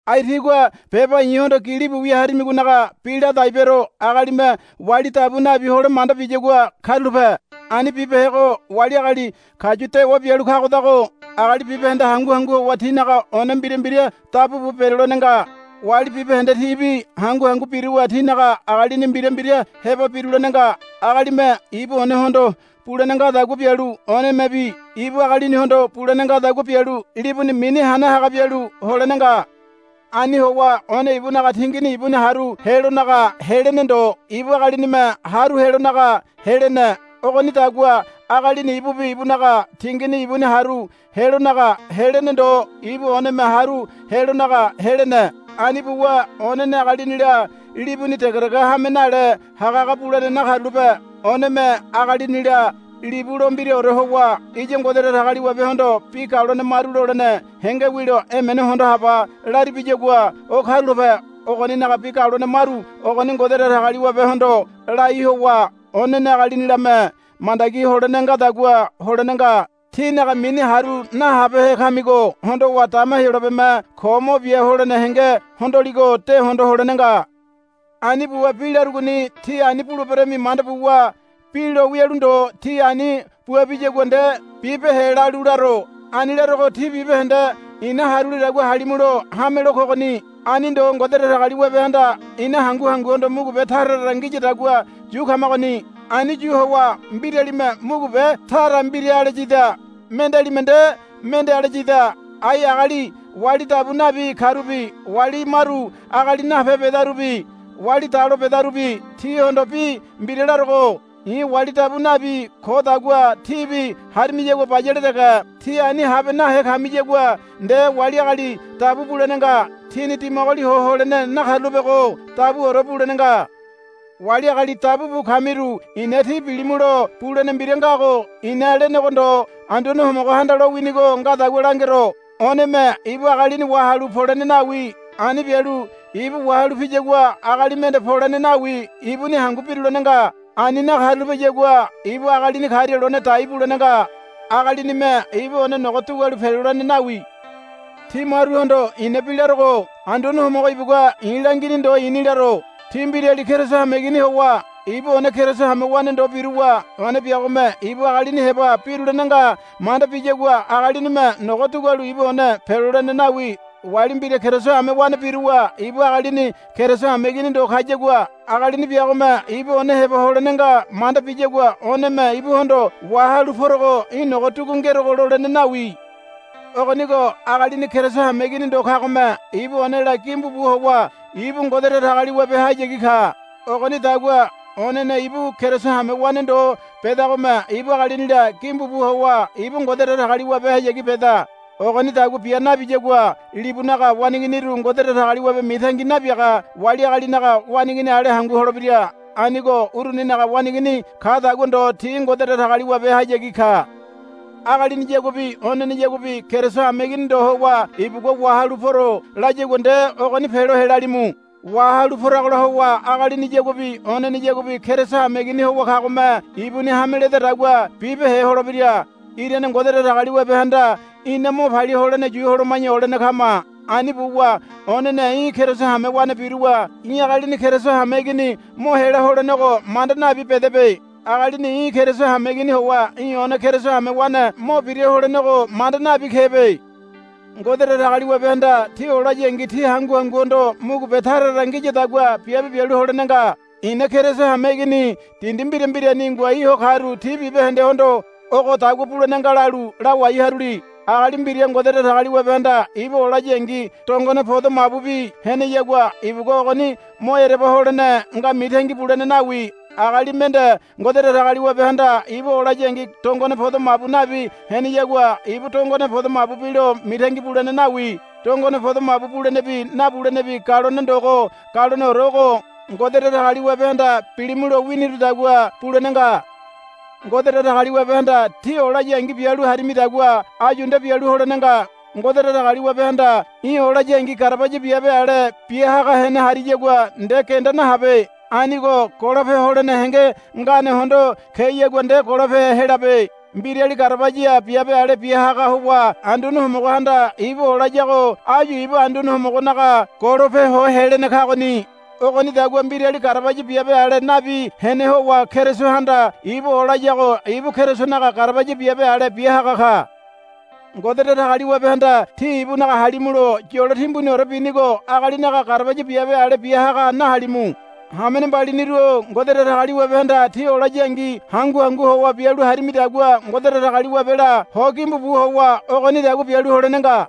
Ai tígua beba i̱hondo gilibu wia harimigonaga bi ladai bero. Agalime wali dabu nabi hole manda biyagua karulape. Ani bibehego wali agali kayu dewa bialu kagodago agali bibahende hangu hangu howa tinaga one mbira mbira dabu bu berelolene nga. Wali bibahende tibi hangu hangu biruwa tinaga agalini mbira mbira heba birulene nga. Agalime ibu onehondo bulene ngadagua bialu onemebi ibu agalinihondo bulene ngadagua bialu libuni mini hana haga bialu holene nga. Ani howa one ibunaga tingini ibuni haru helonaga helene ndo ibu agalinime haru helonaga helene. Ogonidagua agalini ibubi ibunaga tingini ibuni haru helonaga helene ndo ibu oneme haru helonaga helene. Ani buwa onene agalinila libuni degedege hame nale hagahaga bulene nakarulape. Oneme agalinila libu lo mbiraore howa, Iya Ngode Datagaliwabehondo bi galone maru lolene henge wilo emene hondo haba, laribiyagua o karulape. Ogoninaga bi galone maru ogoni Ngode Datagaliwabehondo lai howa onene agalinilame mandagi holene ngadagua holene nga. Tínaga mini haru nahabehe kamigo hondowa dama Heyolabeme ko mo bia holene henge hondoligo de hondo holene nga. Ani buwa bi larugoni tí ani buleberami manda buwa bi lo wialu ndo tí ani bua biyagua nde bibehe lalu laro. Ani larogo tí bibahende ina harulidagua halimulo hamelo kogoni. Ani ndo Ngode Datagaliwabehanda ina hangu hanguhondo mugube tara tara ngiyadagua yu kamagoni. Ani yu howa mbiralime mugube tara mbira ale yida mendealime nde mende ale yida. Ai agali wali dabu nabi karubi wali maru agali nape bedarubi wali dalo bedarubi tíhondo bi mbira larogo. I̱ wali dabu nabi kodagua tíbi harimiyagua bayale dege. Tí ani habe nahe kamiyagua nde wali agali dabu bulene nga. Tíni dimagoli ho holene nakarulapego dabuore bulene nga. Wali agali dabu bu kamiru i̱na tí bilimulo bulene mbira ngago i̱na lenego ndo Anduane Homogohanda lowinigo ngadagua langero. Oneme ibu agalini wahalu polene nawi. Ani bialu ibu wahalu piyagua agali mende polene nawi ibuni hangu birulene nga. Ani nakarulapeyagua ibu agalini karia lone dai bulene nga. Agalinime ibu one nogo dugualu pelolene nawi. Tí maruhondo ina bi larogo Anduane Homogo ibugua i̱ langini ndo i̱ni laro. Tí mbirali Keriso hameigini howa ibu one Keriso hamewane ndo biruwa one biagome ibu agalini heba birulene nga manda biyagua agalinime nogo dugualu ibu one pelolene nawi. Wali mbira Keriso hamewane biruwa ibu agalini Keriso hameigini ndo kayagua agalini biagome ibu one heba holene nga manda biyagua oneme ibuhondo, Wahalu porogo í̠ nogo dugu ngerogo, lolene nawi. Ogonigo agalini Keriso hameigini ndo kagome ibu onela gimbu bu howa ibu Ngode Datagaliwabehayagi ka. Ogonidagua onene ibu Keriso hamewane ndo bedagome ibu agalinila gimbu bu howa ibu Ngode Datagaliwabehayagi beda. Ogonidagua bia nabiyagua libunaga waneiginiru Ngode Datagaliwabe mitangi nabiaga wali agalinaga waneigini ale hangu holebira. Anigo uruninaga waneigini kadagua ndo ti Ngode Datagaliwabehayagi ka. Agaliniyaguabi oneneyaguabi Keriso hameigini ndo howa ibugua, Wahalu poro, layagua nde ogoni pelo helalimu. Wahalu poragola howa agaliniyaguabi oneneyaguabi Keriso hameigini howa kagome ibuni hame ledadagua bibehe holebira. Irane Ngode Datagaliwabehanda ina mo palia holene yu holoma̱ya olene kama. Ani buwa onene í̠ Keriso hamewane biruwa í̠ agalini Keriso hameigini mo hela holenego manda nabi bedebe. Agalini í̠ Keriso hameigini howa í̠ one Keriso hamewane mo bira holenego manda nabi kebe. Ngode Datagaliwabehanda tí olayangi tí hangu hanguhondo mugube tara tara ngiyadagua biabe bialu holene nga. I̱na Keriso hameigini dindi mbira mbirani ngoai ho karu ti bibahendehondo ogodagua bulene nga lalu lawai haruli. Agali mbira Ngode Datagaliwabehanda ibu olayangi dongone podo mabubi heneyagua ibugua ogoni mo ereba holene nga mitangi bulene nawi. Agali mende Ngode Datagaliwabehanda ibu olayangi dongone podo mabu nabi heneyagua ibu dongone podo mabu bilo mitangi bulene nawi. Dongone podo mabu bulenebi nabulenebi galone ndogo galoneore ogo. Ngode Datagaliwabehanda, Bilimu, lo winirudagua bulene nga. Ngode Datagaliwabehanda tí olayangi bialu harimidagua áyu nde bialu holene nga. Ngode Datagaliwabehanda í̠ olayangi garabaya biabe ale bia haga hene hariyagua nde genda nahabe. Anigo golope holene henge ngane hondo keyagua nde golope helabe. Mbirali garabaya biabe ale bia haga howa Anduane Homogohanda ibu olayago áyu ibu Anduane Homogonaga golope ho helene kagoni. Ogonidagua mbirali garabaya biabe ale nabi hene howa Kerisohanda ibu olayago ibu Kerisonaga garabaya biabe ale bia haga ka. Ngode Datagaliwabehanda tí ibunaga halimulo yolo timbuniore binigo agalinaga garabaya biabe ale bia haga nahalimu. Hamene mbaliniru-o Ngode Datagaliwabehanda tí olayangi hangu hangu howa bialu harimidagua Ngode Datagaliwabela ho gimbu bu howa ogonidagua bialu holene nga.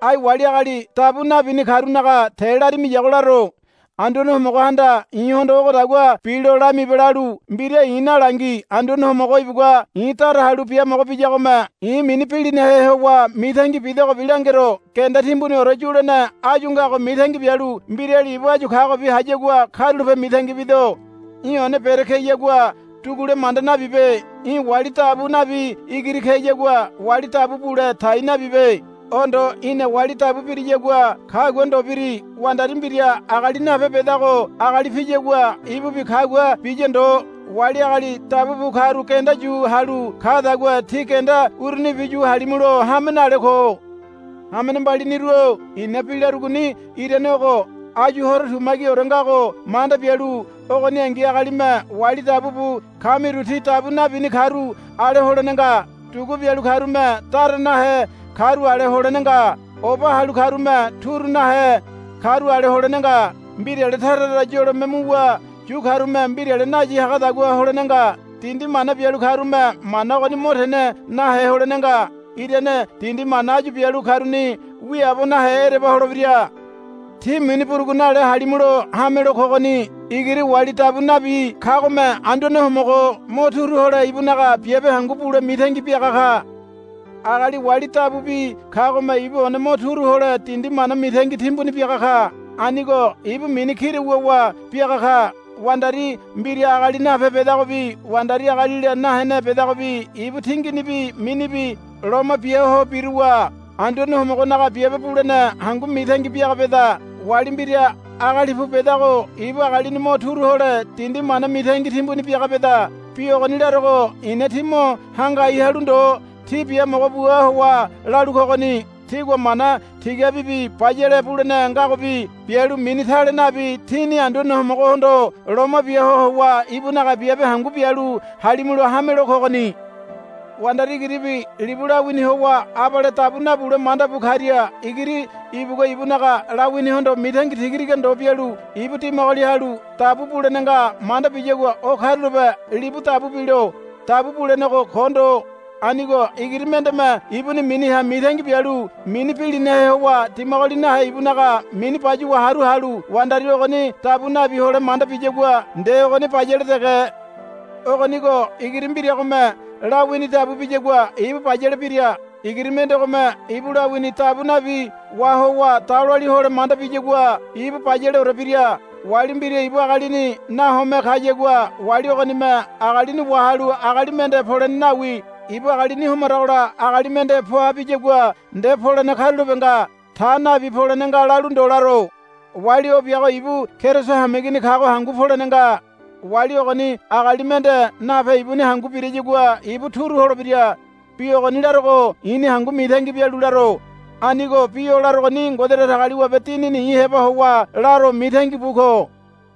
Ai wali agali dabu nabini karunaga te larimiyago laro. Anduane Homogohanda i̱hondo, Ogodagua bilo lamibe, lalu mbira i̱ nalangi. Anduane Homogo ibugua i̱ dara halu biamogo biyagome i̱ mini bilinahe howa mitangi bidogobi langero. Genda timbuniore yulene áyu ngago mitangi bialu mbirali ibu áyu kagobi hayagua karulape mitangi bido. Í̠ one bere keyagua dugule manda nabibe. Í̠ wali dabu nabi igiri keyagua wali dabu bule tai nabibe. O ndo í̠na wali dabu biriyagua kagua ndo biri. Wandari mbira agali nape bedago agali piyagua ibubi kagua biya ndo. Wali agali dabu bu karu genda yu halu kadagua tí genda urunibi yu halimulo hame nale ko. Hamene mbaliniru-o i̱na bi larugoni irane ogo. Áyu horo tumagiore ngago manda bialu ogoningi agalime wali dabu bu kamiru ti dabu nabini karu ale holene nga. Dugu bialu karume dara nahe karu ale holene nga. Oba halu karume turu nahe karu ale holene nga. Mbirale tara tara yolome muwa yu karume mbirale nayi hagadagua holene nga. Dindi mana bialu karume mana ogoni mo tene nahe holene nga. Irane dindi mana áyu bialu karuni wiaabo nahe ereba holebira. Tí mini burugu nale halimulo hamelo kogoni. Igiri wali dabu nabi kagome Anduane Homogo mo turu hole ibunaga biabe hangu bule mitangi biaga ka. Agali wali dabubi kagome ibu one mo turu hole dindi mana mitangi timbuni biaga ka. Anigo ibu mini kira wuwa biaga ka. Wandari mbira agali nape bedagobi wandari agalila nahene bedagobi ibu tinginibi minibi loma bia ho biruwa Anduane Homogonaga biabe bulene hangu mitangi biaga beda. Wali mbira agali pu bedago ibu agalini mo turu hole dindi mana mitangi timbuni biaga beda. Bi ogoni larogo i̱na tí mo hangai halu ndo tí biamogo bua howa lalu kogoni. Tígua mana tigabibi bayale bulene ngagobi bialu mini tale nabi tíni Anduane Homogohondo loma bia ho howa ibunaga biabe hangu bialu halimulo hamelo kogoni. Wandari igiribi libu lawini howa abale dabu nabule manda bu karia igiri ibugua ibunaga lawinihondo mitangi tigatiga ndo bialu ibu dimagoli halu dabu bulene nga manda biyagua o karulape libu dabu bilo. Dabu bulenego ko ndo. Anigo igiri mendeme ibuni miniha mitangi bialu mini bilinahe howa dimagoli nahe ibunaga mini bayuwa haru halu wandari ogoni dabu nabi hole manda biyagua nde ogoni bayale dege. Ogonigo igiri mbiragome lawini dabu biyagua ibu bayale bira. Igiri mendegome ibu lawini dabu nabi wahowa daloali hole manda biyagua ibu bayaleore bira. Wali mbira ibu agalini nahome kayagua wali ogonime agalini wahalu agali mende polene nawi. Ibu agalini homaragola agali mende poa biyagua nde polene karulape nga. Ta nabi polene nga lalu ndo laro. Wali o biago ibu Keriso hameigini kago hangu polene nga. Wali ogoni agali mende nape ibuni hangu birayagua ibu turu holebira. Bi ogoni larogo i̱ni hangu mitangi bialu laro. Anigo bi o larogoni Ngode Datagaliwabe Dinini i̱ heba howa laro mitangi bu ko.